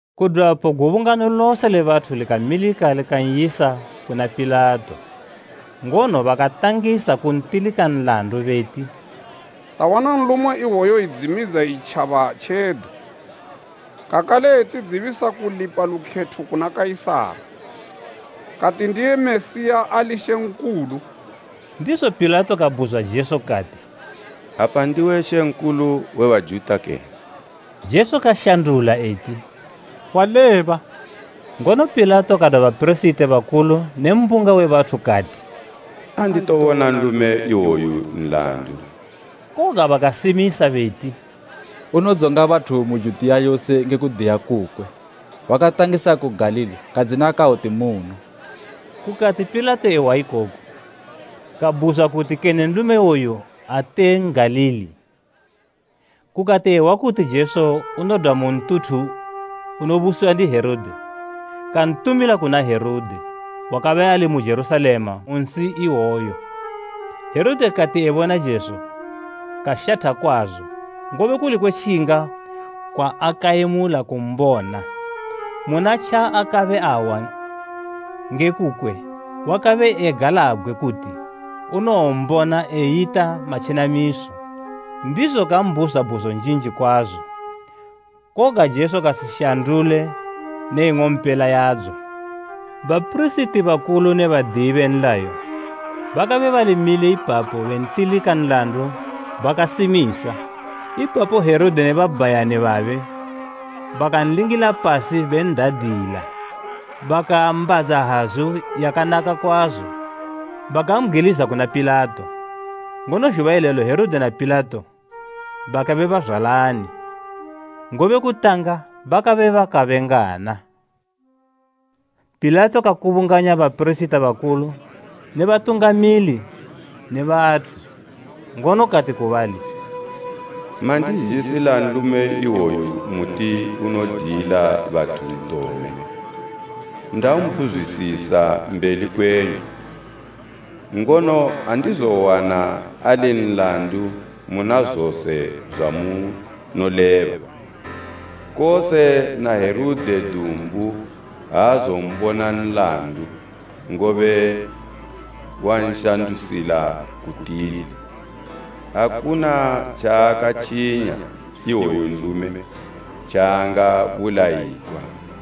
Kudwapo gubungano lose le bathu likamilika likan'yisa kuna Pilato. Ngono bakatangisa kuntilika nlandu beti, “Tawana nlume iwoyu edzimidza itjaba tjedu, kakale etidzibisa kulipa lukhetho kuna Kaisara, kati ndiye Mesiya ali mambo.” Ndizo Pilato kabhuzwa Jesu kati, “Apa ndiwe mambo we Bajuta kene?” Jesu kashandula eti, “Waleba.” Ngono Pilato kadwa bapirisiti bakulu ne mbunga we bathu kati, “Anditobona nlume iwoyu nlandu.” Koga bakasimisa beti, “Unodzonga bathu mu Judiya yose nge kudiya kukwe. Wakatangisa ku Galili, kadzina kawoti muno.” Kukati Pilato ehwa ikoku, kabhuzwa kuti kene nlume iwoyu ate N'galili. Kukati ehwa kuti Jesu unodwa mu ntuthu unobusiwa ndi Herode, kantumila kuna Herode, wakabe ali mu Jerusalema mu nsi iyeyo Herode kati ebona Jesu, kashatha kwazo, ngobe kuli kwetjinga kwaakayemula kumbona. Muna tjaakabe ahwa nge kukwe, wakabe egalabgwe kuti unowombona eyita matjenamiso. Ndizo kambhuzwa bhuzo njinji kwazo, koga Jesu kasishandule ne ing'ompela yadzo. Bapirisiti bakulu ne badiyi be nlayo, bakabe bali mile ipapo bentilika nlandu bakasimisa. Ipapo Herode ne babhayani babe bakanlingila pasi ben'dadila. Bakaambadza hazu yakanaka kwazo, bakambgwiliza kuna Pilato. Ngono zhuba ilelo Herode na Pilato bakabe bazwalani, ngobe kutanga bakabe bakabengana. Pilato kakubunganya bapirisiti bakulu ne batungamili ne bathu, ngono kati ku bali, “Mandizhisila nlume iwoyu muti unodiyila bathu ntome. Ndambhuzwisisa mbeli kwenyu, ngono andizowana ali nlandu muna zose zwamunoleba. Kose na Herode dumbu aazombona nlandu, ngobe wanshandusila ku tili. Akuna tjaakatjinya iwoyu nlume tjaangabulayigwa.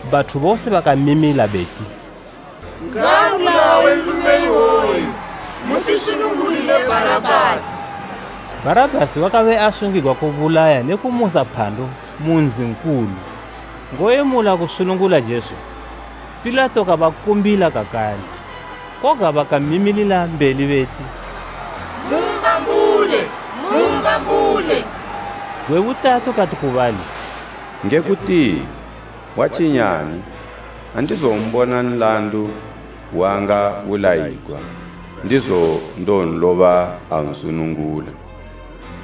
Bathu bose bakamimila beti, “ngaabulawe nlume iwoyu! Mutisunungulile Bharabhasi!” Bharabhasi wakabe asungigwa kubulaya ne kumusa phandu mu nzi nkulu. Ngoyemula kusunungula Jesu, Pilato kabakumbila kakale, koga bakamimilila mbeli beti “Mumbambule! Mumbambule!” Gwe butatu kati ku bali, “Nge kutini? Watjinyani? Andizombona nlandu, waangabulayigwa. Ndizo ndowonloba, ansunungula.”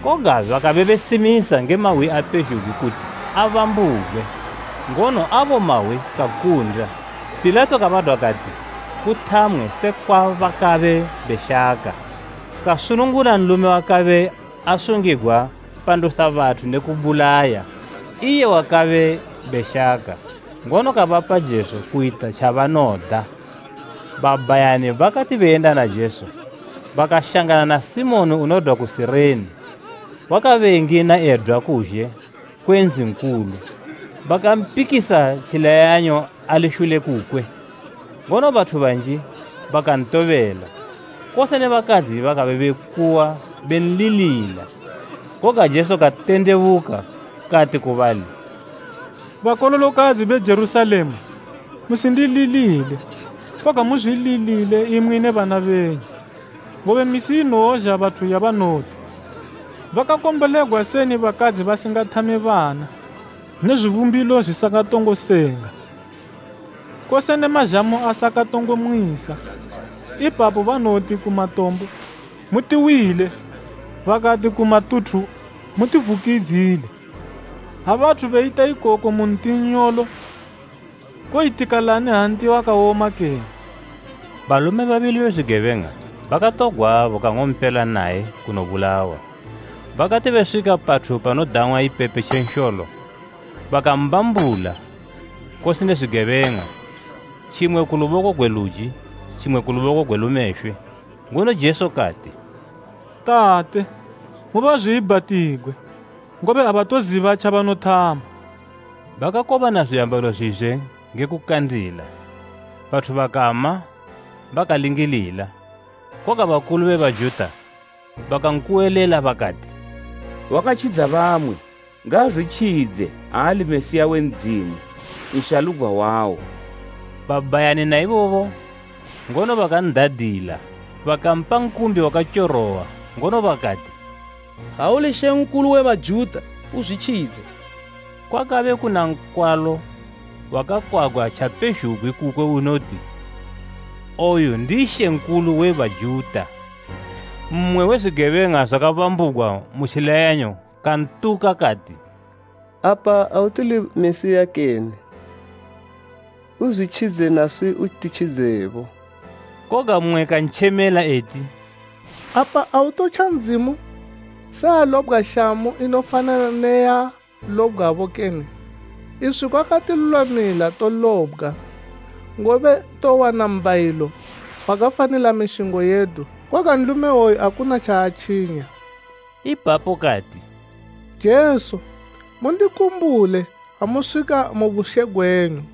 Koga bakabe besimisa nge mahwi apezhugwi kuti abambugwe, ngono abo mahwi kakunda. Pilato kabadwa kati kuthamwe sekwa bakabe beshaka. Kasunungula nlume wakabe asungigwa pandusa bathu ne kubulaya, iye wabakabe beshaka, ngono kabapa Jesu kuyita tjabanoda. Babhayani bakati beyenda na Jesu bakashangana na Simoni unodwa ku Sirene, wakabe engina edwa kuzhe kwe nzi nkulu, bakampikisa tjileyanyo ali shule kukwe. Ngono bathu banji bakantobela, kose ne bakadzi bakabe bekuwa benlilila. Koga Jesu katendebuka, kati ku bali, “Bakololokadzi be Jerusalema, musindililile, koga muzwililile, imwi ne bana benyu. Ngobe misi inowozha bathu yabanowoti, ‘Bakakombolegwa seni bakadzi basingathame bana ne zwibumbilo zwisakatongo senga, kose ne mazhamu asakatongo mwisa!’ Ipapo banowoti ku matombo, ‘Mutiwile,’ bakati ku matuthu ‘Mutivukidzile!’ Ha bathu beyita ikoku mu nti nnyolo, kowoyitikalani ha nti wawoma kene?” Balume babili be zwigebeng'a, bakatogwabo kang'ompela naye kunobulawa. Bakati beswika pathu panodang'wa Ipepe tje Nsholo, bakambambula, kose ne zwigebeng'a, tjimwe ku luboko gwe luji tjimwe ku luboko gwe lumeshwe. Ngono Jesu kati, “Tate, mubazwiibhatigwe, ngobe abatoziba tjabanothama.” Bakakobana zwiambalo zwizwe nge kukandila. Bathu bakama bakalingilila, koga bakulu be Bajuta bakankuwelela bakati, “Wakatjidza bamwe, ngaazwitjidze, ha ali Mesiya we Ndzimu, Nshalugwa wawo.” Babhayani na ibobo ngono bakan'dadila. Bakampa nkumbi wakatyorowa, ngono bakati, “Ha uli Mambo we Bajuta, uzwitjidze.” Kwakabe kuna nkwalo wakakwagwa tjapezhugwi kukwe unoti, “OYU NDI MAMBO WE BAJUTA.” Mmwe we zwigebeng'a zwakabambugwa mu tjileyanyo kantuka, kati, “Apa ate uli Mesiya kene? Uzwitjidze naswi utitjidze bo!” Koga mmwe kantjemela eti, “Apa autotja Ndzimu se walobgwa shamu inofanana ne yaalobgwabo kene? Iswi kwakatilulwamila tolobgwa, ngobe towana mbhayilo wakafanila mishingo yedu. Koga nlume iwoyu akuna tjaatjinya.” Ipapo kati, “Jesu, mundikumbule ha muswika mu bushe gwenyu.”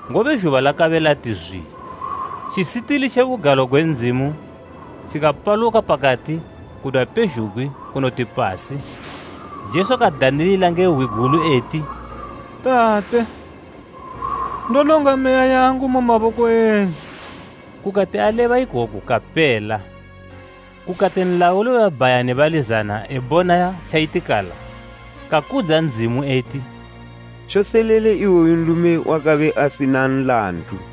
ngobe zhuba lakabe lati zwi. Tjisitili tje Bugalo gwe Ndzimu tjikapaluka pakati kudwa pezhugwi kunoti pasi. Jesu kadanilila nge hwi gulu eti, “Tate, ndolonga meya yangu mu maboko enyu.” Kukati aleba ikoku kapela. Kukati nlauli we babhayani bali zana ebona tjayitikala kakudza Ndzimu eti, “Tjoselele, iwoyu nlume wakabe asina nlandu.”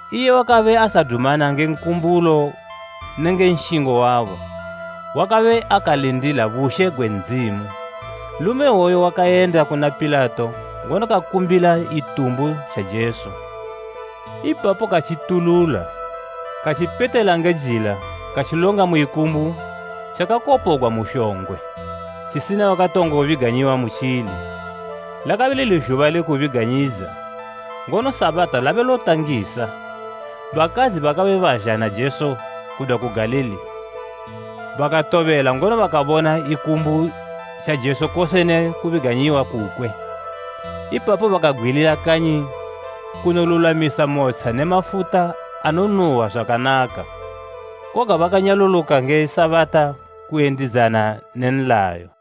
Iye wakabe asadumana nge nkumbulo nenge nshingo wabo. Wakabe akalindila bushe gwe Ndzimu. Nlume iwoyo wakayenda kuna Pilato ngono kakumbila Itumbu tja Jesu. Ipapo katjitulula, katjipetela nge jila katjilonga mu ikumbu tjakakopogwa mu shongwe, tjisina wakatongo biganyiwa mutjili. Lakabe lili Zhuba le Kubiganyidza, ngono Sabata labe lotangisa. Bakadzi bakabe bazha na Jesu kudwa ku Galili bakatobela ngono bakabona ikumbu tja Jesu kose ne kubiganyiwa kukwe. Ipapo bakabgwilila kanyi kunolulwamisa motsha ne mafuta anonuhwa zwakanaka. Koga bakanyaluluka nge Sabata kuyendidzana ne nlayo.